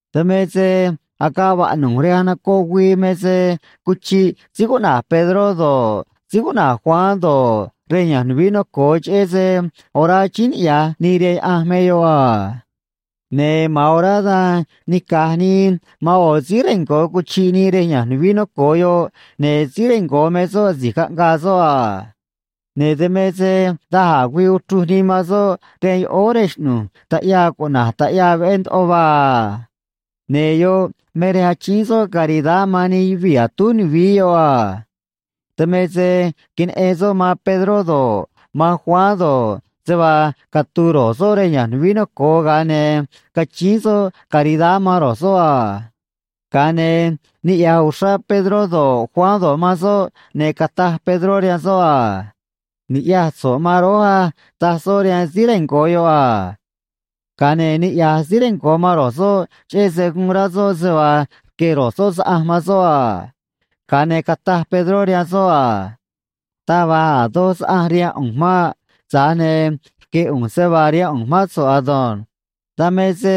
Dan me se agaꞌ vaꞌnu̱j rej anocoꞌ güii me se cuchiꞌ síí cuꞌna̱j Pedró do̱ꞌ, síí cuꞌna̱j Juan do̱ꞌ, rej ya̱nj nuvií noco̱o, cheꞌé se orá achíín niꞌya̱j nii rihaan Yaꞌanj me yoꞌ a. Ne̱ ma̱an orá dan nica̱j nii man ꞌo̱ síí rengo̱ cuchiꞌ nii rej ya̱nj nuvií noco̱o yoꞌ, ne̱ síí rengo̱ me soꞌ asi̱j caꞌngaa soꞌ a. Ne̱ dan me se da̱j a̱ güii uchruj nii man soꞌ rihaan yoꞌóó rej xꞌnu̱j taꞌyaa cuꞌna̱j Taꞌyaa Veꞌé Ndoꞌo Vaa a. Ne̱ yoꞌ me rej achíín soꞌ caridad man nij yuvii̱ atúj nuvií yoꞌ a. Dan me se queneꞌen soꞌ man Pedró do̱ꞌ, man Juan do̱ꞌ, se vaa catu̱u̱ ro̱j soꞌ rej ya̱nj nuvií noco̱o, ga̱a ne̱ cachíín soꞌ caridad man ro̱j soꞌ a. Ga̱a ne̱ niꞌya̱j uxrá Pedró do̱ꞌ, Juan do̱ꞌ, man soꞌ, ne̱ cataj Pedró rihaan soꞌ a: ―Ni̱ꞌyaj so̱ꞌ man rój á ―taj soꞌ rihaan síí rengo̱ yoꞌ a. Ga̱a ne̱ niꞌya̱j síí rengo̱ man ro̱j soꞌ, cheꞌé se guun rá soꞌ se vaa rque̱ ro̱j soꞌ saꞌanj man soꞌ a. Ga̱a ne̱ cataj Pedró rihaan soꞌ a: ―Taj va̱j a̱ doj saꞌanj rihaan ꞌu̱nj maꞌ. Tza̱j ne̱ rque̱ ꞌu̱nj se vaa rihaan ꞌu̱nj mán so̱ꞌ ado̱nj. Dan me se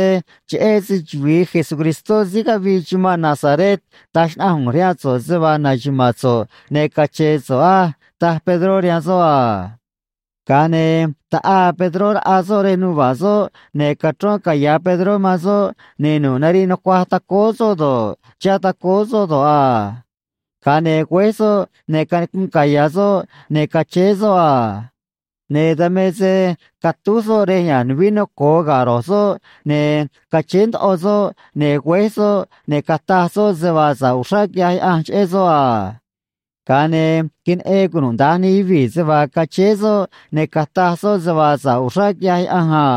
cheꞌé se‑chuvi̱i Jesucristó síí cavii chumanꞌ Nazaret taj xnaꞌanj ꞌu̱nj rihaan so̱ꞌ se vaa na̱xuma̱a̱n so̱ꞌ ne̱ cache̱e̱ so̱ꞌ á ―taj Pedró rihaan soꞌ a. Ga̱a ne̱ taꞌaa Pedró raꞌa soꞌ rej nuva̱ꞌ soꞌ, ne̱ cachrón caya̱ Pedró man soꞌ, ne̱ nu̱ꞌ nariꞌ nucuaj tacóó soꞌ do̱ꞌ, chihá tacóó soꞌ do̱ꞌ a. Ga̱a ne̱ güéj soꞌ, ne̱ canicunꞌ caya̱ soꞌ, ne̱ cachéé soꞌ a. Ne̱ dan me se catúj soꞌ rej ya̱nj nuvií noco̱o ga̱ ro̱j soꞌ, ne̱ cachéé ndoꞌo soꞌ, ne̱ güéj soꞌ, ne̱ cataj soꞌ se vaa sa̱ꞌ uxrá quiꞌyaj Yaꞌanj cheꞌé soꞌ a. Ga̱a ne̱ queneꞌen cunuda̱nj nij yuvii̱ se vaa cachéé soꞌ ne̱ cataj soꞌ se vaa sa̱ꞌ uxrá quiꞌyaj Yaꞌanj a.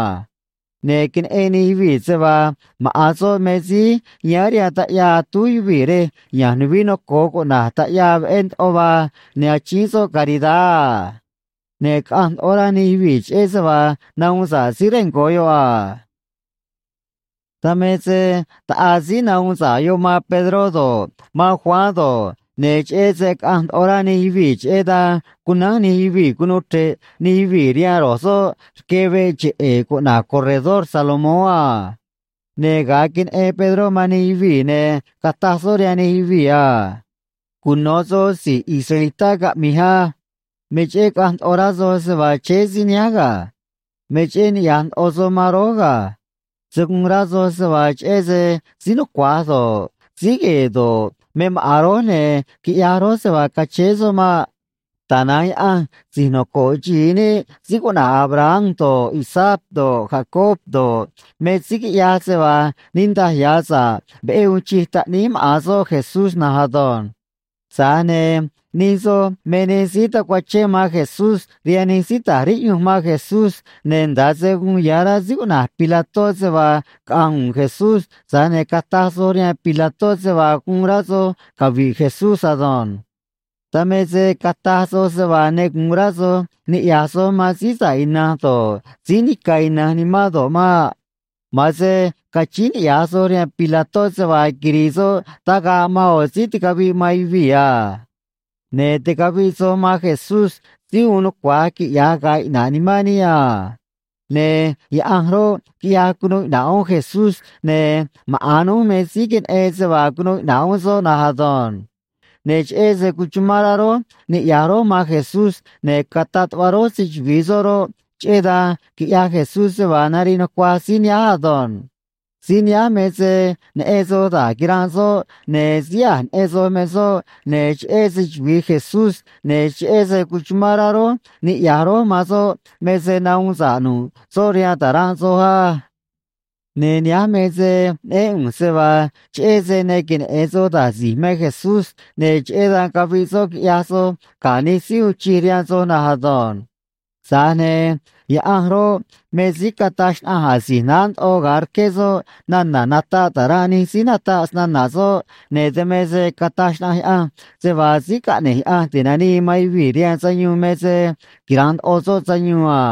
Ne̱ queneꞌen nij yuvii̱ se vaa maꞌa̱n soꞌ me síí yáán rihaan taꞌyaa atúj yuvii̱ rej ya̱nj nuvií noco̱o cuꞌna̱j Taꞌyaa Veꞌé Ndoꞌo Vaa ne̱ achíín soꞌ caridad a. Ne̱ caꞌanj ndoꞌo rá nij yuvii̱ cheꞌé se vaa nahuun sa̱ꞌ síí rengo̱ yoꞌ a. Dan me se taꞌaa síí nahuun sa̱ꞌ yoꞌ man Pedró do̱ꞌ, man Juan do̱ꞌ, ne̱ cheꞌé se caꞌanj ndoꞌo rá nij yuvii̱, cheꞌé dan cunánj nij yuvii̱ cunuu chre̱ꞌ nij yuvii̱ rihaan ro̱j soꞌ rque veꞌ cheꞌe̱e̱ cuꞌna̱j Corredor Salomón a. Ne̱ ga̱a queneꞌen Pedró man nij yuvii̱, ne̱ cataj soꞌ rihaan nij yuvii̱ a: ―Cuno̱ soj si̱j israelitá caꞌmi̱j á. Me cheꞌé caꞌanj ndoꞌo rá soj se vaa chéé síí nihánj ga̱. Me cheꞌé niꞌya̱j ndoꞌo soj man rój ga̱. Se̱ guun rá soj se vaa cheꞌé se síí nucua̱j do̱ꞌ, síí gue̱e̱ do̱ꞌ, me maꞌa̱n rój, ne̱ quiꞌyaj rój se vaa cachéé soꞌ maꞌ. Tana̱nj Yaꞌanj si̱j noco̱ꞌ xi̱i níꞌ síí cuꞌna̱j Abraham do̱ꞌ, Isaac do̱ꞌ, Jacob do̱ꞌ, me síí quiꞌyaj se vaa niꞌndaj ya̱ sa̱ꞌ veꞌé uun chij Taꞌníí maꞌa̱n soꞌ Jesús na̱nj ado̱nj. Tza̱j ne̱ nij soj me nij síí tacuachén man Jesús rihaan nij síí ta̱j riꞌyunj man Jesús, ne̱ nda̱ꞌ se guun ya̱ rá síí cuꞌna̱j Pilató se vaa caꞌa̱nj u̱u̱n Jesús, tza̱j ne̱ cataj soj rihaan Pilató se vaa guun rá soj cavi̱ꞌ Jesús ado̱nj. ’Dan me se cataj soj se vaa ne gu̱un rá soj ni̱ꞌyaj soj man Síí Sa̱ꞌ Ina̱nj do̱ꞌ, Síí Nica̱ Ina̱nj Nimán do̱ꞌ maꞌ. Ma̱an se cachíín niꞌya̱j soj rihaan Pilató se vaa quiri̱i̱ soꞌ tagaꞌ man ꞌo̱ síí ticaviꞌ man yuvii̱ a. Ne̱ ticaviꞌ soj man Jesús síí uun nucua̱j quiꞌya̱j ga̱a̱ iꞌna̱ꞌ nimán níꞌ a. Ne̱ Yaꞌanj roꞌ, quiꞌyaj cunuu iꞌna̱ꞌ uún Jesús, ne̱ maꞌa̱n núj me síí queneꞌen se vaa cunuu iꞌna̱ꞌ uún soꞌ na̱nj ado̱nj. Ne̱ cheꞌé se cuchumán rá rój niꞌya̱j rój man Jesús ne̱ cataꞌ tuꞌva rój se‑chuvi̱i soꞌ roꞌ, cheꞌé dan quiꞌyaj Jesús se vaa nariꞌ nucuaj síí nihánj ado̱nj. Síí nihánj me se neꞌen soj da̱j quiranꞌ soꞌ, ne̱ síí a̱j neꞌen soj me soꞌ, ne̱ cheꞌé se‑chuvi̱i Jesús ne̱ cheꞌé se cuchumán rá rój niꞌya̱j rój man soꞌ me se nahuun sa̱ꞌ nu̱ꞌ soꞌ rihaan ta̱ranꞌ soj á. ’Ne̱ nihánj me se neꞌén ꞌu̱nj se vaa cheꞌé se ne queneꞌe̱n soj da̱j si̱j me Jesús, ne̱ cheꞌé dan caviꞌ soꞌ quiꞌyaj soj ga̱ nij síí uun chij rihaan soj na̱nj ado̱nj. Tza̱j ne̱ Yaꞌanj roꞌ, me síí cataj xnaꞌanj asi̱j naá ndoꞌo ga̱a rqué soꞌ nana̱ nataꞌ ta̱ranꞌ nij síí nataꞌ snana̱ soꞌ, ne̱ dan me se cataj xnaꞌanj Yaꞌanj se vaa Síí Caꞌne̱j Yaꞌanj Ti̱nanii man Yuvii̱ rihaan Sayuun me se quira̱nꞌ ndoꞌo soꞌ sayuun a.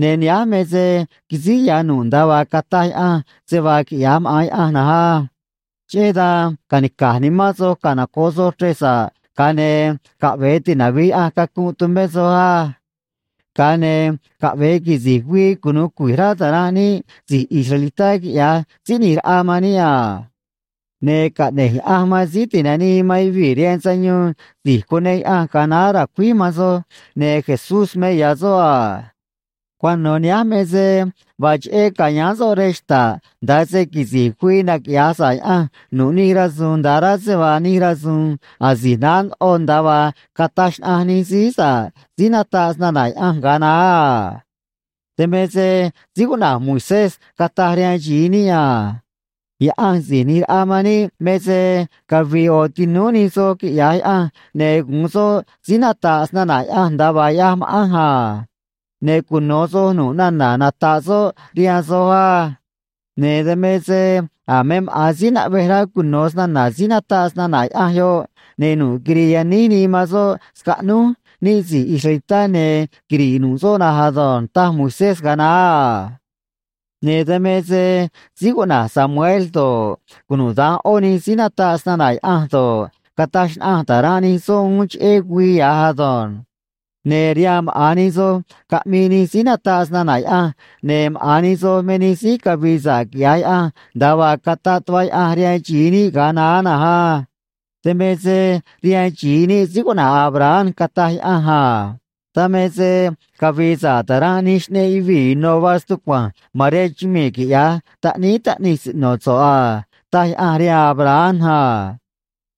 Ne̱ nihánj me se quisíj ya̱ nu̱ꞌ nda̱a vaa cataj Yaꞌanj se vaa quiꞌya̱j maꞌa̱n Yaꞌanj na̱nj á. ’Cheꞌé dan ca̱nica̱j nimán soj canoco̱ꞌ soj chrej sa̱ꞌ, ga̱a ne̱ caꞌve̱e tinavi̱j Yaꞌanj cacunꞌ tumé soj á. Ga̱a ne̱ caꞌve̱e quisi̱j güii cunu̱u cui̱j rá ta̱ranꞌ níꞌ si̱j israelitá, quiꞌya̱j Síí ꞌNi̱j Raꞌa man níꞌ a. Ne̱ caꞌne̱j Yaꞌanj man Síí Tinanii man Yuvii̱ rihaan Sayuun, si̱j cuneꞌ Yaꞌanj ga̱a naá ra̱cuíj man soj, ne̱ Jesús me ya̱ soꞌ a. Cuano̱ nihánj me se vaa cheꞌé ca̱yáán soꞌ rej xta̱ꞌ nda̱a se quisi̱j güii naquiꞌya̱j sa̱ꞌ Yaꞌanj nu̱ꞌ nij rasu̱u̱n nda̱a rá se vaa nij rasu̱u̱n asi̱j naá ndoꞌo nda̱a vaa cataj xnaꞌanj nij síí sa̱ꞌ síí nataꞌ snana̱ Yaꞌanj ga̱a naá a. Dan me se síí cuꞌna̱j Moisés cataj rihaan xi̱i níꞌ a: “Yaꞌanj Si̱j ꞌNi̱j Raꞌa man níꞌ me se cavi̱i̱ ꞌo̱ tinúú nij soj, quiꞌya̱j Yaꞌanj, ne̱ gu̱un soꞌ síí nata̱ꞌ snana̱ Yaꞌanj nda̱a vaa ꞌyaj ma̱ꞌanj a. Ne̱ cuno̱ soj nu̱ꞌ nana̱ nata̱ꞌ soꞌ rihaan soj á. Ne̱ dan me se a̱ me maꞌa̱n síí naꞌvej rá cuno̱ snana̱ síí nata̱ꞌ snana̱ Yaꞌanj yoꞌ, ne̱ nu̱ꞌ quiri̱i̱ yaníj nii man soꞌ scaꞌnúj níꞌ si̱j israelitá, ne̱ quiri̱ꞌ nu̱ꞌ soꞌ na̱nj ado̱nj”, taj Moisés ga̱a naá a. Ne̱ dan me se síí cuꞌna̱j Samuel do̱ꞌ, cunuda̱nj ꞌó nij síí nataꞌ snana̱ Yaꞌanj do̱ꞌ, cataj xnaꞌanj ta̱ranꞌ nij soꞌ uún cheꞌé güii ya̱j ado̱nj. ’Ne̱ rihaan maꞌa̱n nij soj caꞌmii nij síí nataꞌ snana̱ Yaꞌanj, ne̱ maꞌa̱n nij soj me nij síí cavi̱i̱ sa̱ꞌ quiꞌya̱j Yaꞌanj, nda̱a vaa cataꞌ tuꞌva Yaꞌanj rihaan xi̱i níꞌ ga̱a naá na̱nj á. Dan me se rihaan xi̱i níꞌ síí cuꞌna̱j Abraham cataj Yaꞌanj a: “Dan me se cavi̱i̱ sa̱ꞌ ta̱ranꞌ nij xꞌneꞌ yuvii̱ ino̱ vaa stucua̱nj ma̱n rihaan chumii̱, quiꞌya̱j taꞌníí taꞌnij siꞌno̱ so̱ꞌ a”, taj Yaꞌanj rihaan Abraham a.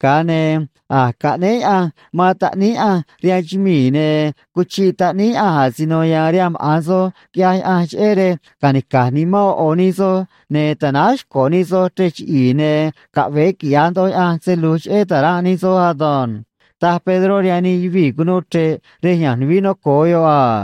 Ga̱a ne̱ a̱j caꞌnéé Yaꞌanj man Taꞌníí Yaꞌanj rihaan chumii̱, ne̱ cuchiꞌ Taꞌníí Yaꞌanj asino ya̱a̱n rihaan maꞌa̱n soj, quiꞌyaj Yaꞌanj, cheꞌé rej ca̱nica̱j nimán ꞌo̱ ꞌo̱ nij soj, ne̱ ta̱náj xco̱ nij soj chrej chiꞌi̱i̱, ne̱ caꞌve̱e quiꞌya̱j ndoꞌo Yaꞌanj se lu̱j cheꞌé ta̱ranꞌ nij soj ado̱nj ―taj Pedró rihaan nij yuvii̱ cunuu chre̱ꞌ rej ya̱nj nuvií noco̱o yoꞌ a.